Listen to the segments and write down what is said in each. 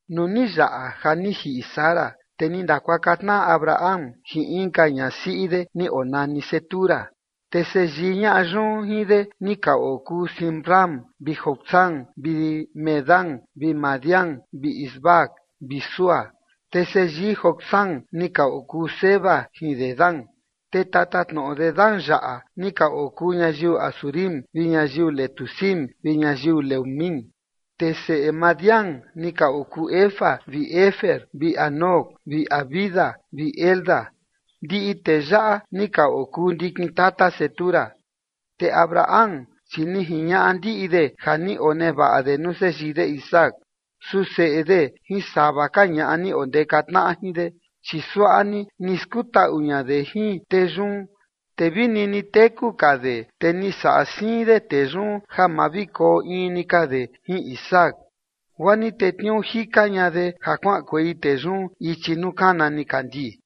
Nuu ni yaꞌa ja ni jiꞌi Sara, te ni ndakuaka tnaꞌa Abraham jin inka ñasiꞌi de ni onani Cetura. Te seyii ñaꞌa yun jin de ni ka okuu Zimram vi Jocsán vi Medán vi Madián vi Isbac vi Súa. Te seyii Jocsán ni ka okuu Seba jin Dedán, te tatatnoꞌo Dedán yaꞌa ni ka okuu ñayiu Asurim vi ñayiu Letusim vi ñayiu Leumim. Te seꞌe Madián ni ka okuu Efa vi Efer vi Hanoc vi Abida vi Elda. Ndiꞌi tee yaꞌa ni ka okuu ndikin tata Cetura. Te Abraham, chi ni jiñaꞌa ndiꞌi de ja ni onevaꞌa de nuu seyii de Isaac. Su seꞌe de jin sava ka ñaꞌa ni ondeka tnaꞌa jin de, chi suaꞌa ni ni skutaꞌu ña de jin tee yun. Te vi nini teku ka de, te ni saꞌa siin de tee yun ja ma vi koo in ni ka de jin Isaac, guaa ni tetniuu jika ña de ja kuaꞌankuei tee yun ichi nuu kana nikandii.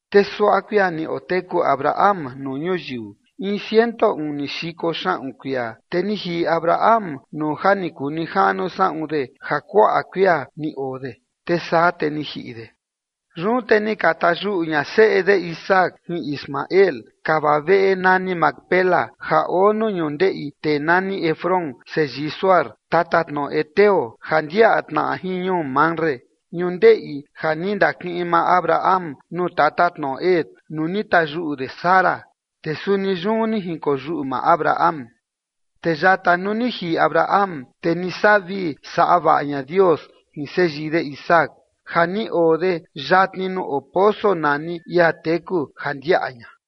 Te suaꞌa kuia ni oteku Abraham nuu ñuyiu: in ciento uni xiko xaꞌun kuia. Te ni jiꞌi Abraham nuu ja ni kuu nijaꞌnu saꞌun de ja kuaꞌa kuia ni oo de, te saa te ni jiꞌi de. Yun te ni ka tayuꞌu ña seꞌe de Isaac jin Ismael kava veꞌe nani Macpela ja oo nuu ñundeꞌi tee nani Efrón seyii Zohar, tatatnoꞌo heteo ja ndiaꞌa tnaꞌa jin ñuu Mamre, ñundeꞌi ja ni ndakiꞌin maa Abraham nuu tatatnoꞌo Het nuu ni tayuꞌu de Sara, te suni yun ni jinkoyuꞌu maa Abraham. Te yata nuu ni jiꞌi Abraham, te ni saꞌa vii saꞌa vaꞌa ña Dios jin seyii de Isaac ja ni oo de yatni nuu oo poso nani ia teku ja ndiaꞌa ña.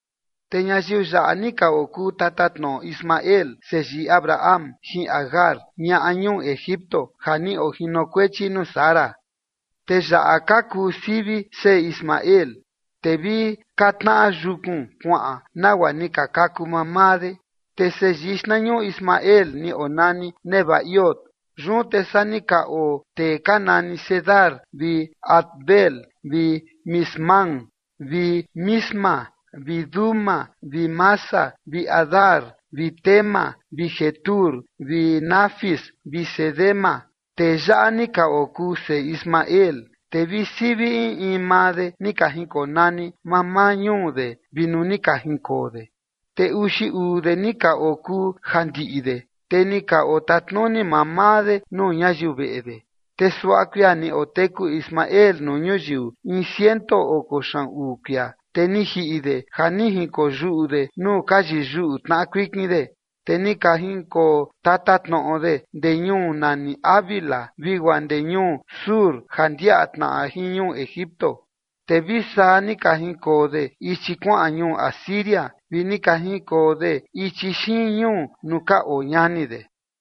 Te ñayiu yaꞌa ni ka okuu tatatnoꞌo Ismael seyii Abraham jin Agar, ñaꞌa ñuu Egipto ja ni ojinokuechi nuu Sara. Te yaꞌa ka kuu sivi seꞌe Ismael, te vi ka tnaꞌa yukun kuaꞌan nagua ni ka kaku mamaa de. Te seyii xtnañuꞌu Ismael ni onani Nebaiot. Yun te saa ni ka oo tee ka nani Cedar vi Adbeel vi Mibsam vi Misma vi Duma vi Massa vi Hadar vi Tema vi Jetur vi Nafis vi Cedema. Tee yaꞌa ni ka okuu seꞌe Ismael, te vi sivi in in maa de ni ka jinkonani mamaa ñuu de vi nuu ni ka jinkoo de. Te uxi uu de ni ka okuu ja ndiꞌi de, te ni ka otatnuni mamaa de nuu ñayiu veꞌe de. Te suaꞌa kuia ni oteku Ismael nuu ñuyiu: in ciento oko xaꞌun uu kuia, te ni jiꞌi de ja ni jinkoo yuꞌu de nuu ka yiyuꞌu tnaꞌa kuikin de. Te ni ka jinkoo tatatnoꞌo de ndee ñuu nani Havila vi guaa ndee ñuu Shur ja ndiaꞌa tnaꞌa jin ñuu Egipto, te vi saa ni ka jinkoo de ichi kuaꞌan ñuu Asiria, vi ni ka jinkoo de ichi xiin ñuu nuu ka oo ñani de.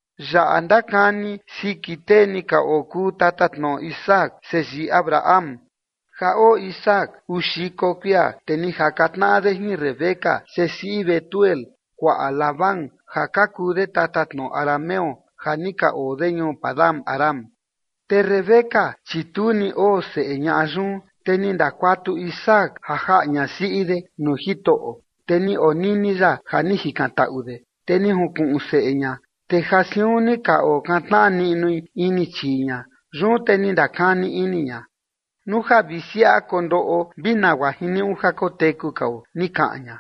Yaꞌa ndakani siki tee ni ka okuu tatatnoꞌo Isaac seyii Abraham. Ja oo Isaac uu xiko kuia, te ni jaka tnaꞌa de jin Rebeca sesiꞌi Betuel kuaꞌa Labán ja ka kuu de tatatnoꞌo arameo ja ni ka oo de ñuu Padan-aram. Te Rebeca, chi tu ni oo seꞌe ñaꞌa yun, te ni ndakuatu Isaac ja jaꞌa ñasiꞌi de nuu Jitoꞌo, te ni onini ya ja ni jikantaꞌu de, te ni junkuꞌun seꞌe ña. Te ja siun ni ka okantnaꞌa niꞌnui ini chii ña. Yun te ni ndakani ini ña: ―Nuu ja vi siaꞌa kondoꞌo vi nagua jiniuꞌu ja koteku kao ―ni kaꞌan ña.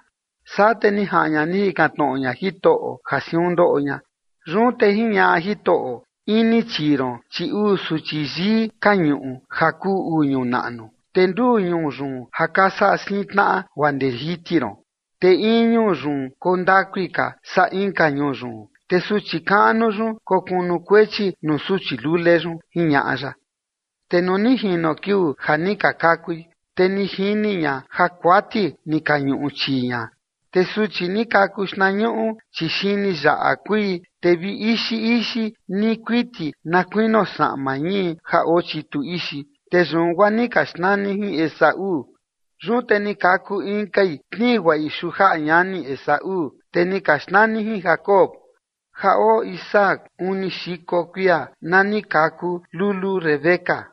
Saa te ni jaꞌan ña ni jikan tnoꞌo ña Jitoꞌo ja siun ndoꞌo ña. Yun te jiñaꞌa Jitoꞌo: Ini chii ron, chi uu suchi yii ka ñuꞌu ja kuu uu ñuu naꞌnu, te nduu ñuu yun ja ka saꞌa siin tnaꞌa guaa ndee jiti ron, te in ñuu yun koo ndakui ka saa inka ñuu yun, te suchi kaꞌnu yun kokunukuechi nuu suchi lule yun, jiñaꞌa ya. Te nuu ni jino kiuu ja ni ka kakui, te ni jini ña ja kuati ni ka ñuꞌu chii ña. Te suchi ni kaku xtnañuꞌu, chi xini yaꞌa kuii, te vi ixi ixi ni kuiti na kuinio saꞌma ñii ja oo chitu ixi, te yun guaa ni ka xnani jin Esaú. Yun te ni kaku inkai tnii guaꞌi xujaꞌa ñani Esaú, te ni ka xnani jin Jacob. Ja oo Isaac uni xiko kuia na ni ka kaku lulu Rebeca.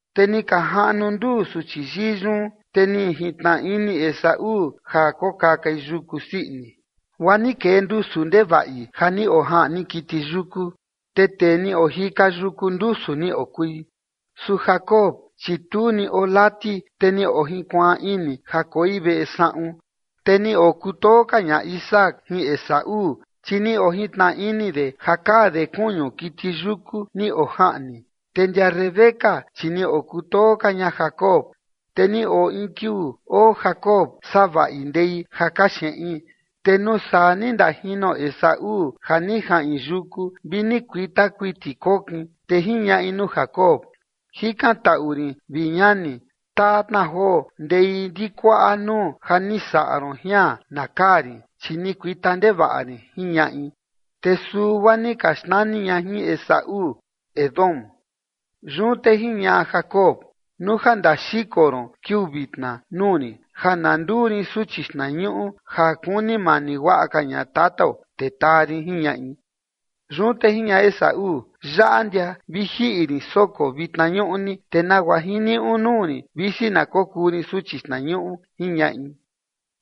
Te ni ka jaꞌnu nduu suchi yii yun. Te ni jintnaꞌa ini Esaú ja kokakai yuku sii ini, guaa ni kee ndusu ndevaꞌi ja ni ojaꞌni kiti yuku, te tee ni ojika yuku ndusu ni okui. Su Jacob, chi tu ni oo lati, te ni ojinkuaan ini ja koi veꞌe saꞌun. Te ni okutoo ka ña Isaac jin Esaú, chi ni ojintnaꞌa ini de ja kaa de kuñu kiti yuku ni ojaꞌni. Te ndia Rebeca, chi ni okutoo ka ña Jacob. Te ni oo in kiuu oo Jacob savaꞌi ndei ja kaxeꞌin, te nuu saa ni ndajino Esaú ja ni jaꞌin yuku vi ni kuita kuiti kokin. Te jiñaꞌi nuu Jacob: ―Jikantaꞌu rin, vi ñani, taa tna joo ndei ndikuaꞌa nuu ja ni saꞌa ron jian na kaa rin, chi ni kuita ndevaꞌa rin ―jiñaꞌi. Te suu guaa ni ka xnani ña jin Esaú, Edom. Yun te jiñaꞌa Jacob: ―Nuu ja ndaxiko ron kiuu vitna nuu rin ja na nduu rin suchi xtnañuꞌu ja kuni mani guaꞌa ka ña tatao, te taa rin ―jiñaꞌi. Yun te jiñaꞌa Esaú: ―Yaꞌa ndia vi jiꞌi rin soko vitna ñuꞌni, te nagua jiniuꞌu nuu rin, visi na kokuu rin suchi xtnañuꞌu ―jiñaꞌi.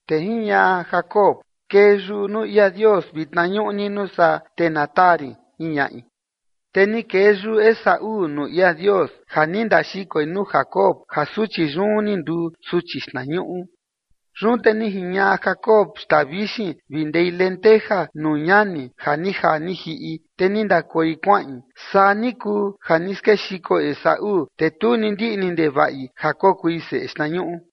Te jiñaꞌa Jacob: ―Kee yuꞌu nuu ia Dios vitna ñuꞌni nuu saa, te na taa rin ―jiñaꞌi. Te ni kee yuꞌu Esaú nuu ia Dios ja ni ndaxikoi nuu Jacob ja suchi yun ni nduu suchi xtnañuꞌu. Yun te ni jiñaꞌa Jacob xtaa vixin vi ndei lenteja nuu ñani ja ni jaa ni jiꞌi, te ni ndakoi kuaꞌin. Saa ni kuu ja ni skexiko Esaú, te tu ni ndiꞌni ndevaꞌi ja kokui seꞌe xtnañuꞌu.